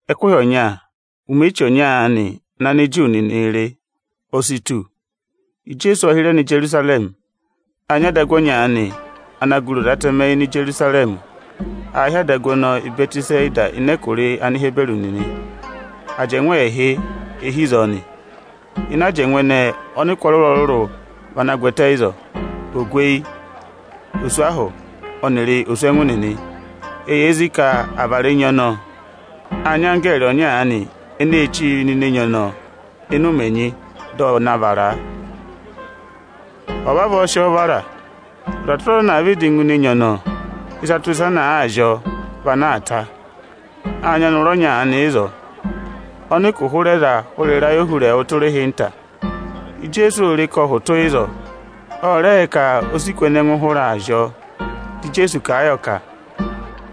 Ẹkụhị ọnya, ụmẹ eche ọnya aanị ana Aniju nịnịị̄ rị, o si tù. Ijeesu ộ hịrẹ nọ Ijerusarẹmị. Â nyị adagu ọnya aanị, ana gụrị Oze Atẹmẹ Íjerusarẹmị. Aā hị́ adagu ọnọọ Ịbẹtịsata ịnị ẹkụra Anihiburu nịnị. Ajẹngụ ẹẹhị e hi ịzọọ nị. Ịnị ajẹngụ ẹnẹẹ, ọnịkụ ọrụrụ-ọrụrụ vị anaā gwẹtẹ ịzọọ: Ogweyi, oswahụ ọnịrị oswẹngụ nịnị. [Eyee zí ka à va vara enyi ọnọọ. Â nyị anggẹẹrị ọnya aanị eneē chíi nọ ini enyi ọnọọ ịnị ụmẹ ẹnyị, dị ọ na vara a. Ọ̀ọ vavọọ sị ọọ vara, ọza tụra ọza ana àa vịdị ngụ ini enyi ọnọọ, ịsa tụra ịsa ana àa zị ọọ vị ana aa ta.] Â nyị ọnọrụ ọnya aanị ịzọọ, ọnị ụkụ hụrẹ za hụrẹ ịrayị ohurẹẹwụ tụra ịhịnta. Ijeesu ô re e ka ọ hụtụ ịzọọ, ọ rẹ yẹ ka o si kù ẹnẹ ẹngụ hụrẹ aa zị ọọ. Dị Ijeesu kà a yọ ka,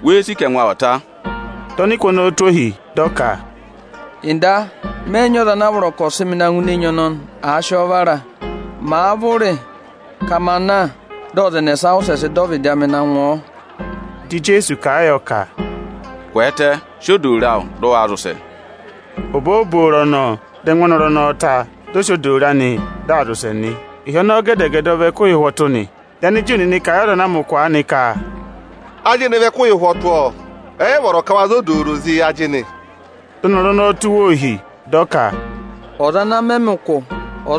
“Wéé sì ka ẹngụ awụ ọ̀ ta?” Dị ọnịkụ ọnọọ tụ́ ọ ọ ohi, dị ọ ka, “Ọga, mẹ yị nyị ọza ana a vọrọ ka ọ̀ sị mị na ngụ ini enyi ọnọnị, àa sị ọọ vara. Màaa vụrị ka ma na, dị ọza ẹnẹsa wụsẹ sị dọ ọvịdị amị na ngụ ọ.” Dị Ijeesu kà a yọ ka, “Kwẹẹtẹ, sị odooro awụ, dị ụ waa zị ụsẹ!” Obooboro ọnọọ, dị ẹngụ ọnọrụ ọnọọ ta, dị ọ sị odooro anị, dị aa zị ụsẹ nị. Ịhị ọnọọ gẹdẹ-gẹdẹ ọ vị ẹkụhị ụhwọtụ nị. Dị Aniju nịnị kà a yị ọza ana a mẹ ụkụ aanị ka, “Ajịnị vị ẹkụhị ụhwọtụ, ọ! Ẹ yị vọrọ ka waa za odooro zị ajịnị.” Dị ọnọrụ ọnọọ tụ́ wa ohi, dị ọ ka, “Ọza ana mẹ mị ụkụ, ọ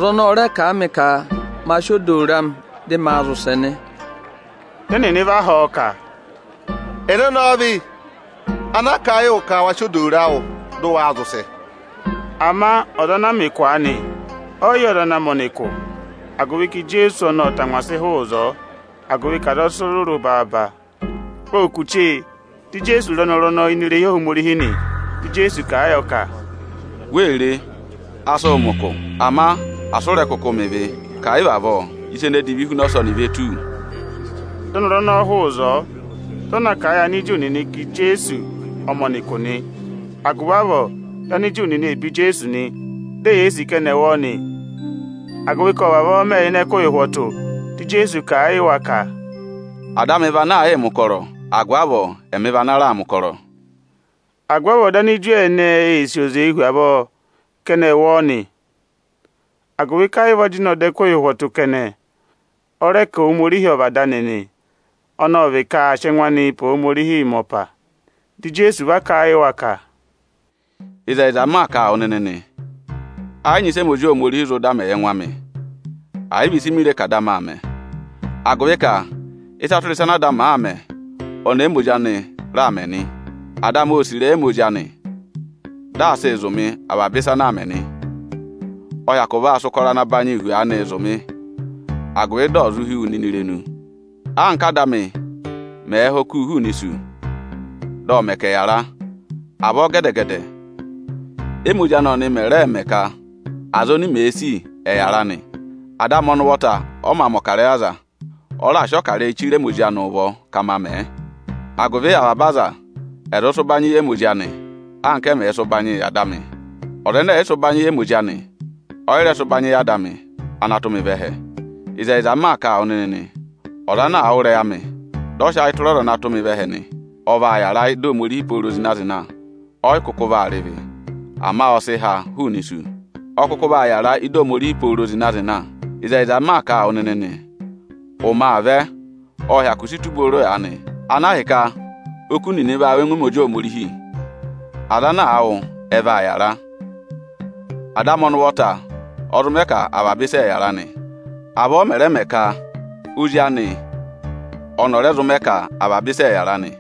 kà a mị ka ma sị odooro amị, dị maa zị ụsẹ nị.” Dị ẹnịnị va họ̀ ọ ka, “Ẹnẹ ọnọọ vị, ana kà a yị wụ ka wa sị odooro awụ, dị ụ waa zị ụsẹ?” Ama ọza ana a mẹ ụkụ aanị, ọ yị yẹ ọza ana mẹ̀ ọnị ụkụ, agụvị ka Ijeesu ộ tangwa sị hụụ ịzọọ, agụvị ka aza ẹ sị rụrụ baaba. Ộ kù chee, dị Ijeesu re ọnọrụ ọnọọ ini irehi Ohomorihi nị. Dị Ijeesu kà a yọ ka, “Wee re, a sị wụ mẹ ụkụ; ama asị ụ rẹ̀ kụkụ mẹ ịvị, ka ẹ̀ yị vị avọọ, ịsa ene divi hu ọsọnị ve tù wu!” Dị ọnọrụ ọnọọ hụụ ịzọọ, dị ọ na kà a yị Aniju nịnị ka Ijeesu ọ mẹ̀ ọnị ụkụ nị. Agụvị avọọ, dị Aniju nịnị ee be Ijeesu, di eyee sì ka ẹnị ẹ̀ wụ ọọ nị; agụvị ka ộ vavọọ mẹ ịnị ẹkụhị ụhwọtụ. Dị Ijeesu kà a yị wa ka, “Ada amị aà yịị mẹ̀ ụkọrọ va ngụ ọyaanị, agụvị avọọ ẹmị raa yịị mẹ̀ ụkọrọ nị.” Agụvị avọọ dị Aniju ẹnẹẹ ee sì oze hu avọọ ka ẹnị ẹ̀ wụ ọọ nị, agụvị ka ẹ yị vị ọ jịnẹ ọda ẹkụhị ụhwọtụ kẹnẹ, ọ rẹ ka Ohomorihi ọ vị Ada anị nị, ọnọọ vị ka aa sị ẹngụ anịị pe Ohomorihi mẹ ọpa. Dị Ijeesu va kà a yị wa ka, “Ịzẹyịza m maa kà a wụ nịnị nị, ẹ yị nyị ịsị ẹmị Ozi Ohomorihi zụ dà mẹ yị ẹngụ amị, ẹ̀ yị vị ịsị mèe re ka Ada amị aa mẹ; agụvị ka ịsa tụra ịsa ana Ada amị àaa mẹ, ọnị émi Ozi anị raa mẹ nị. Ada amị ô sì ịrẹyị ẹmị Ozi anị, dị aa sị avaba ịsa ọnị ọnị ụvọta aa mẹẹ zụ̀ mị nị. Ọ hyakụ vaa sị ụkọrọ ana banyị hu aanị zụ̀ mị, agụvị di ò zụ hí wu nịnị irenu. Anka Áda amị mẹ̀ẹ̄ ha oku hụụnị isu, dị ọ mẹ ka ẹ̀ yàra, avọọ gẹdẹ-gẹdẹ ẹ́mị Ozi anị ọnị mẹ̀ rẹẹ̄ mẹ ka aza oni mèe sì, ẹ̀ yàra nị. Ada amị ọnị ụvọta ọ mā mẹ̀ ọkarẹyị yị aza. Ọ raà sị ọkarẹyị chire ẹmị Ozi anị ụvọ ka maa mẹ̀ ẹ, agụvị avaba aza ẹ̀ zụ sị ụbanyị yị ẹmị Ozi anị, anka ẹ mẹ̀ẹ̄ sị ụbanyị yị Ada amị. Ọza ẹnẹ ẹ̀ yị sị ụbanyị yị ẹmị Ozi anị, ọ yị rẹ sị ụbanyị yị Ada amị, ana tụ́ mị vẹ ẹhẹ. “Ịzẹyịza m maa kà a wụ nịnị nị, ọza ana àa wụ́ ịrẹyị amị, dị ọ sị ayị tụra ọza ana tụ́ mị vẹ ẹhẹ nị, ọ vaa yàra ị́dị Ohomorihi pooro zịna-zịna. Ọ yị kụkụ vaa rị ịvị, ama ọ sị ha hụụnị isu, ọ kụkụ vaa yàra ị́dị Ohomorihi pooro zịna-zịna. Ịzẹyịza m maa kà a wụ nịnị nị, ụmẹ aa vẹ, ộ hyakụ si tù booro aanị, ana ahịka oku nịnị vaa wụ́ ọngwẹ ẹmị Ozi Ohomorihi. Aza ana àa wụ́, ẹ vaa yàra. Ada amị ọnị ụvọta ọ zụ mẹ ka avaba aza ẹ̀ yàra nị. Avọọ ọ mẹ̀ rẹ mẹ ka Ozi anị ọnị ọ̀ rẹ zụ mẹ ka avaba aza ẹ̀ yàra nị.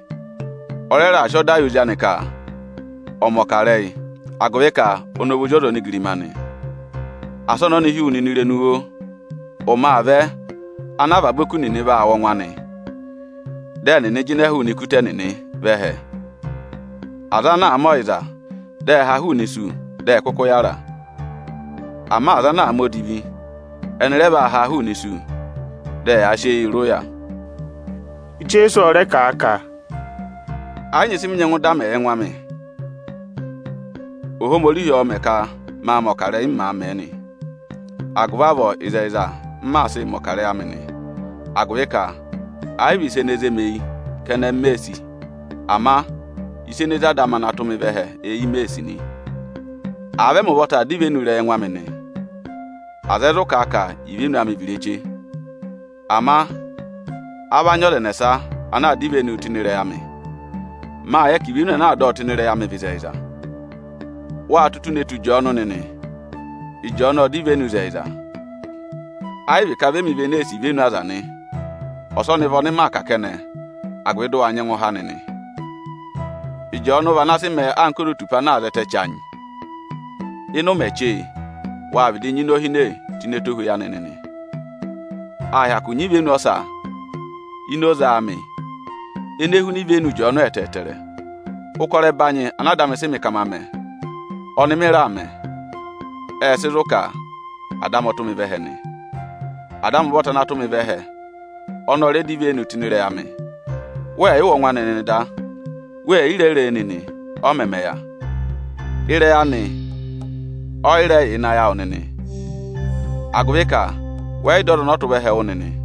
Ọ rẹ raà sị ọda yị Ozi anị ka ọ̀ọ mẹ̀ ọkarẹyị, agụvị ka ọnị ọ vị Ozi ọza onigirima nị. Asị ọnọnị hí wu nịnị irenu, oo! Ụmẹ aa vẹ ana avaba oku nịnị vaa wụ́ ọngwẹ anị. Dị ẹnịnị jịnẹ hụụnị ikuta ẹnịnị vẹ ẹhẹ. Aza ana àa mẹ ọyịza, dị ẹ ha hụụnị isu, dị ẹ kụkụ yàra. Ama aza ana àa mẹ odivi, ẹnị rẹ vaa haa hụụnị isu, dị aa mẹ̀ ọkarẹyị isu yị wa.” Ẹnẹ dọ ivenu ịrẹyị Ijeesu? Ijeesu ọ rẹ kà a ka, “Ẹ yị nyị ịsị mị nyẹngụ dà mẹ yị ẹngụ amị. Óhomorihi ọ̀ọ mẹ̀ ka ma mẹ̀ ọkarẹyị, m maa mẹ̀ ẹ nị. Agụvị avọọ ịzẹyịza m maa sịị mẹ̀ ọkarẹyị amị nị, agụvị ka ẹ yị vị ịsa ene zé mi eyi kẹnẹ m mee sì, ama ịsa ene zé Ada amị ana tụ́ mị vẹ ẹhẹ eyi m mee sì nị. Àa vị ẹmị ụvọta aa dọ ivenu ịrẹyị ẹngụ amị nị, aza ẹ zụ kà a ka ivenu amị vị ireche. Ama a va nyị ọza ẹnẹsa ana aa dọ ivenuu tụ́ ịnị ịrẹyị amị; mâ yẹ ka ivenu ana aa dọ ọ tụ́ ịnị ịrẹyị amị vị ịzẹyịza. Wâ tụ́ ụtụ ne tù Ịjọọnụ nịnị. Ịjọọnụ ộ dọ ivenu ịzẹyịza. Ẹ yị vị ka vị ẹmị vị ene ee sì ivenu aza nị; ọsọnị vị ọnị maa kà kẹnẹ, agụvị dị ụ wa nyẹngụ há nịnị. Ịjọọnụ vị ana sị mẹẹ anka ozotupa ana aa zẹtẹ chanyị-chanyị. Ịnị ụmẹ chee, wâ vịdị nyị inohine tụ́ ini ẹtohweyi anị nịnị. Â hyakụ nyị ivenu ọsa ini oze amị ene huna ivenu Ịjọọnụ ẹtẹẹtẹrẹ. Ụkọrọ ẹbanyị ana Ada amị sị mị ka ma mẹ, ọnị mị raa mẹ, ệ sị zụ̀ ka Ada amị ọ tụ́ mị vẹ ẹhẹ nị. “Ada amị ụvọta ana tụ́ mị vẹ ẹhẹ ọnị ọ rẹ dọ ivenu tụ́ ịnị ịrẹyị amị. Wẹẹ̀ yị wụ́ ọngwẹ anị nịnị da, weè yi re re e nịnị, ọ mẹmẹ yà. Ịrẹyị anị ọ yị rẹ yà ịnị ayị awụ nịnị, agụvị ka wẹ yị dọ ọza ọnị ọ tụ́ vẹ ẹhẹ wụ́ nịnị.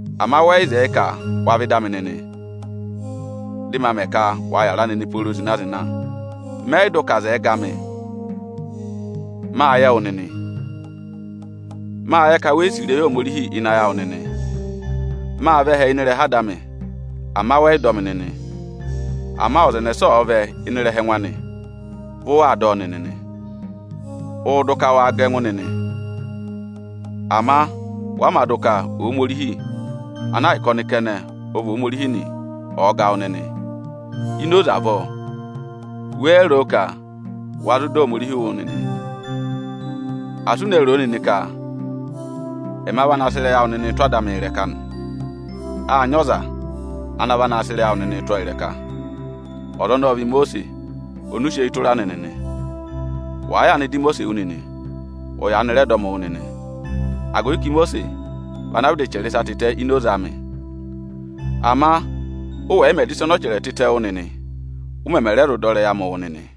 Ama wẹ yị zẹẹ ka wa vẹ ịdị amị nịnị, dị ma mẹ ka wa yàra nịnị pooro zịna-zịna. “Mẹ yị dụ ka aza ẹ̀ẹ ga mị. Mâ yẹ wụ nịnị, mâ yẹ ka we yi sì ịrẹyị Ohomorihi ịnị ayị awụ nịnị. Mâ vẹ ẹhẹ ịnị ịrẹha Ada amị, ama wẹ yị dọ mị nịnị; ama ọza ẹnẹsa ọ̀ọ vẹ ẹhẹ ịnị ịrẹha ẹngụ anị, vị ụ waa dọ ọ nịnị nị. Ụụ̄ dụ ka waa ga ẹngụ nịnị, ama wa mā dụ ka Ohomorihi ana ahịka ọnị kẹnẹ ọ vị Ohomorihi nị, ọ̀ ga wụ nịnị. Ini oze avọọ, wéé ro ka wa zụ dọ Ohomorihi wụ́ nịnị? Asị u ne ro o nịnị ka ẹma va naa sị ịrẹyị awụ nịnịị tụ́ Ada amị ịrẹka nị. Â nyị ọza ana va naa sị ịrẹyị awụ tụ́ ọọ ịrẹka. Ọza ọnọọ ọ vị Imosiisi ọnị ụ sị eyi tụra nịnị nị. Wàa yaanị dọ Imosiisi wụ́ nịnị, ụ yaanị rẹ dọ mị wụ́ nịnị, agụvị ka Imosiisi vị ana vịdị chẹrẹ ịsa tịtẹ ini oze amị. Ama ụ wẹ̀ yị mẹ̀ dọ ịsa ọnị ọ chẹrẹ tịtẹ wụ́ nịnị, ụ mẹmẹ rẹ zụ dọ ịrẹyị amị wụ́ nịnị?”